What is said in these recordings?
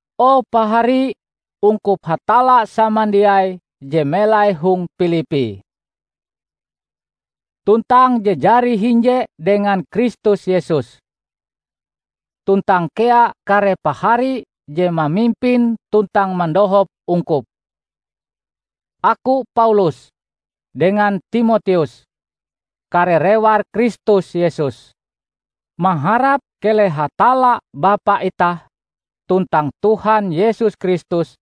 O pahari ungkup Hatalla samandiai je melai hong Pilippi, tuntang je jari hinje dengan Kristus Yesus. Tuntang kea kare pahari je mamimpin tuntang mandohop ungkup! Aku, Paulus, dengan Timoteus, kare rewar Kristus Yesus, maharap keleh Hatalla Bapa itah tuntang Tuhan Yesus Kristus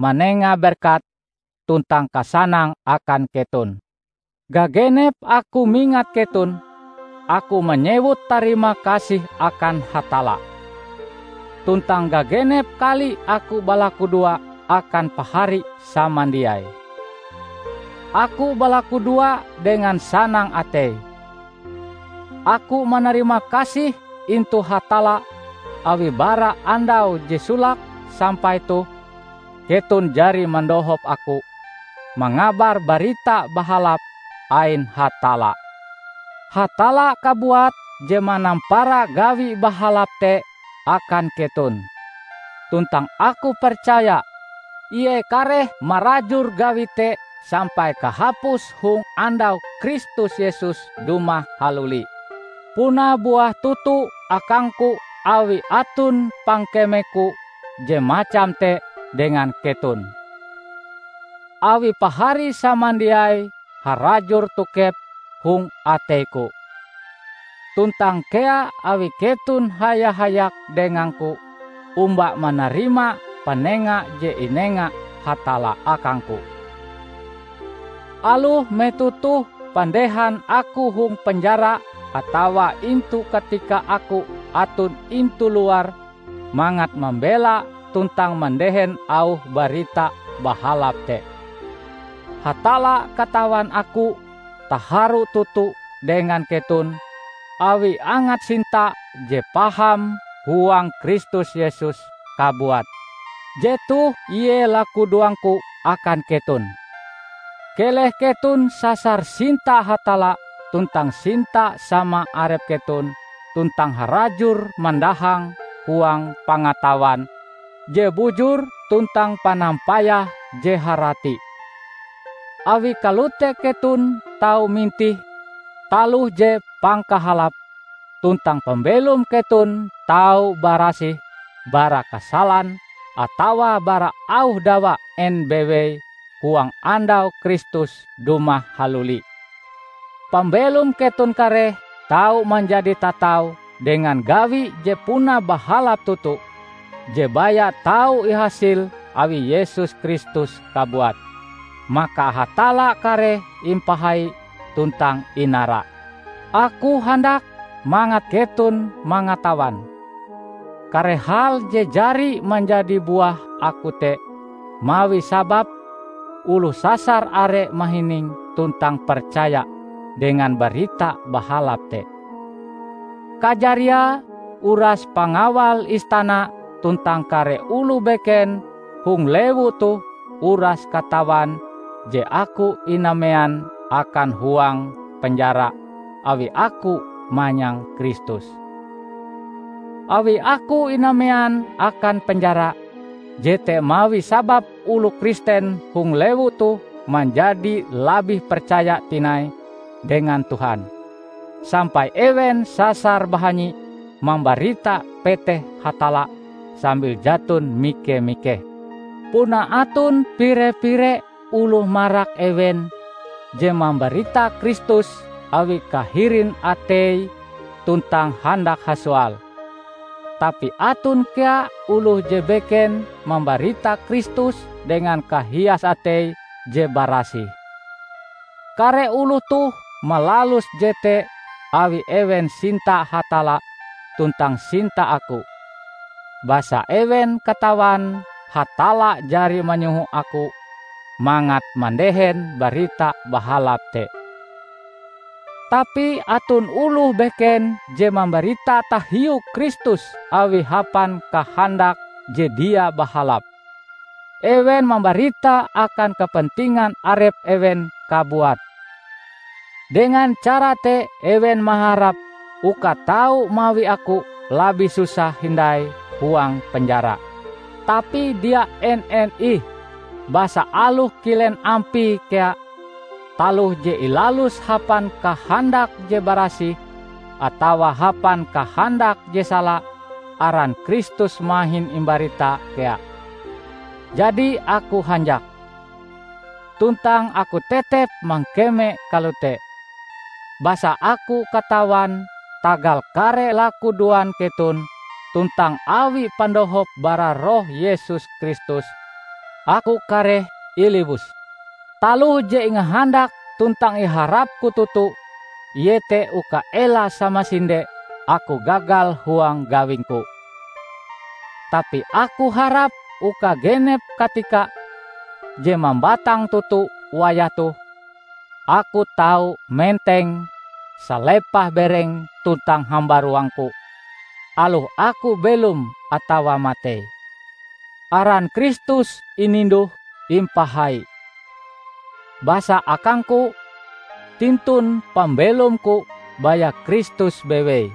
manenga berkat tuntang kasanang akan keton. Gagenep aku mingat keton, aku manyewut tarimakasih akan Hatalla. Tuntang gagenep kali aku balakudoa akan pahari samandiai, aku balakudoa dengan sanang atei. Aku manarimakasih intu Hatalla awi bara andau je solake sampai toh, keton jari mandohop aku mangabar Barita Bahalap ain Hatalla. Hatalla kabuat je manampara gawi bahalap te akan keton, tuntang aku percaya Ie kareh marajur gawi te sampai kahapuse hong Andau Kristus Yesus dumah haluli. Puna buah toto akangku awi aton pangkemeku je macam te dengan keton, awi pahari samandiai harajur tokep hong ateiku. Tuntang kea awi keton haya-hayak dengangku omba manarima panenga je inenga Hatalla akangku; aloh metoh toh pandehan aku hong penjara atawa intu katika aku aton intu luar mangat mambela tuntang mandehen auh Barita Bahalap te. Hatalla katawan aku taharu toto dengan keton awi angat sinta je paham huang Kristus Yesus kabuat. Jetoh ie lakudoangku akan keton: Keleh keton sasar sinta Hatalla tuntang sinta sama arep keton tuntang harajur mandahang huang pangatawan je bujur tuntang panampayah je harati. Awi kalote keton tau mintih taloh je pangkahalape, tuntang pambelom keton tau barasih bara kasalan atawa bara auh dawa en bewei huang andau Kristus dumah haluli. Pambelom keton kareh tau manjadi tatau dengan gawi je puna bahalap toto je baya tau ihasil awi Yesus Kristus kabuat; maka Hatalla kareh impahai tuntang inara. Aku handak mangat keton mangatawan, kare hal je jari manjadi buah aku te mawi sabab oloh sasar are mahining tuntang percaya dengan Barita Bahalap te. Kajariae, uras pangawal istana tuntang kare oloh beken hong lewu toh uras katawan je aku inamean akan huang penjara awi aku manyang Kristus. Awi aku inamean akan penjara, jete mawi sabab oloh Kristen hong lewu toh manjadi labih percaya tinai dengan Tuhan, sampai ewen sasar bahanyi mambarita peteh Hatalla sambil jaton mike-mikeh. Puna aton pire-pire oloh marak ewen je mambarita Kristus awi kahirin ateie tuntang handak hasoal, tapi aton kea oloh je beken mambarita Kristus dengan kahias atei je barasih. Kare oloh toh malalus jete awi ewen sinta Hatalla tuntang sinta aku, basa ewen katawan Hatalla jari manyoho aku mangat mandehen Barita Bahalap te. Tapi aton oloh beken je mambarita tahiu Kristus awi hapan kahandak je dia bahalap; ewen mambarita akan kepentingan arep ewen kabuat. Dengan cara te ewen maharap uka tau mawi aku labih susah hindai huang penjara. Tapi dia en-en ih! Basa aloh kilen ampie kea, taloh je ilalus hapan kahandak je barasih atawa hapan kahandak je sala, aran Kristus mahin imbarita kea; jadi aku hanjak. Tuntang aku tetep mangkeme kalote, basa aku katawan tagal kare lakudoan keton tuntang awi pandohop bara Roh Yesus Kristus, aku kareh iliwus. Taloh je ingahandak tuntang iharapku toto iete uka ela samasinde aku gagal huang gawingku. Tapi aku harap uka genep katika, je mambatang toto wayah toh, aku tau menteng salepah bereng tuntang hambaruangku aloh aku belom atawa matei -- aran Kristus ininduh-impahai. Basa akangku, tintun pambelomku baya Kristus bewei!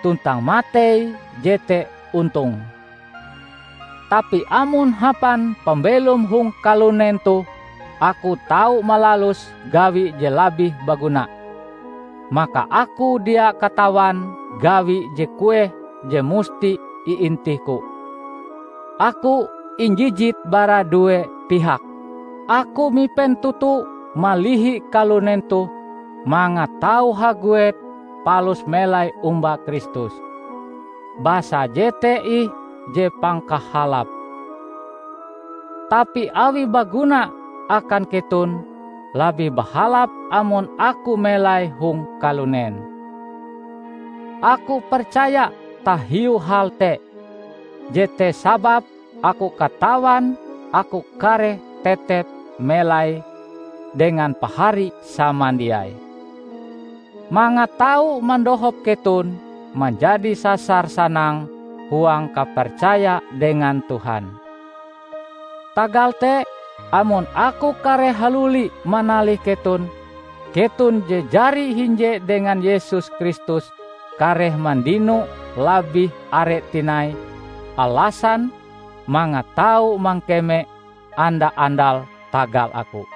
Tuntang matei jete ontong. Tapi amon hapan pambelom hong kalunen toh, aku tau malalus gawi je labih baguna, maka aku dia katawan gawi je kueh je musti iintihku. Aku injijit bara due pihak. Aku mipen toto malihi kalunen toh mangat tau haguet palus melai omba Kristus, basa jete ih je pangkahalape; tapi awi baguna akan keton, labih bahalap amon aku melai hong kalunen. Aku percaya tahiu hal te. Jete sababe aku katawan aku kareh tetep melai dengan pahari samandiai, mangat tau mandohop keton manjadi sasar sanang huang kapercaya dengan Tuhan. Tagal te, amon aku kareh haluli manalih keton, keton je jari hinje dengan Yesus Kristus kareh mandino labih are tinai alasan mangat tau mangkeme anda-andal tagal aku.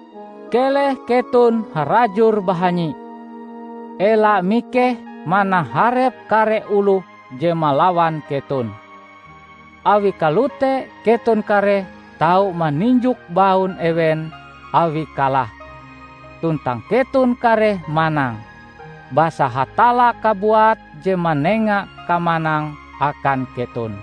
Keleh keton harajur bahanyi; ela mikeh manaharep kare oloh je malawan keton. Awi kalote keton kareh tau maninjok baun ewen awie kalah, tuntang keton kareh manang, basa Hatalla kabuat je manenga kamanang akan keton.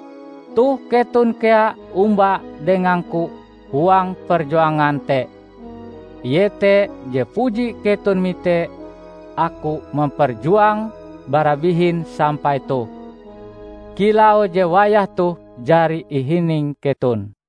Toh keton kea omba dengangku huang perjuangan te; iete je puji keton mite aku memperjuange bara bihin sampai toh, kilau je wayah toh jari ihining keton.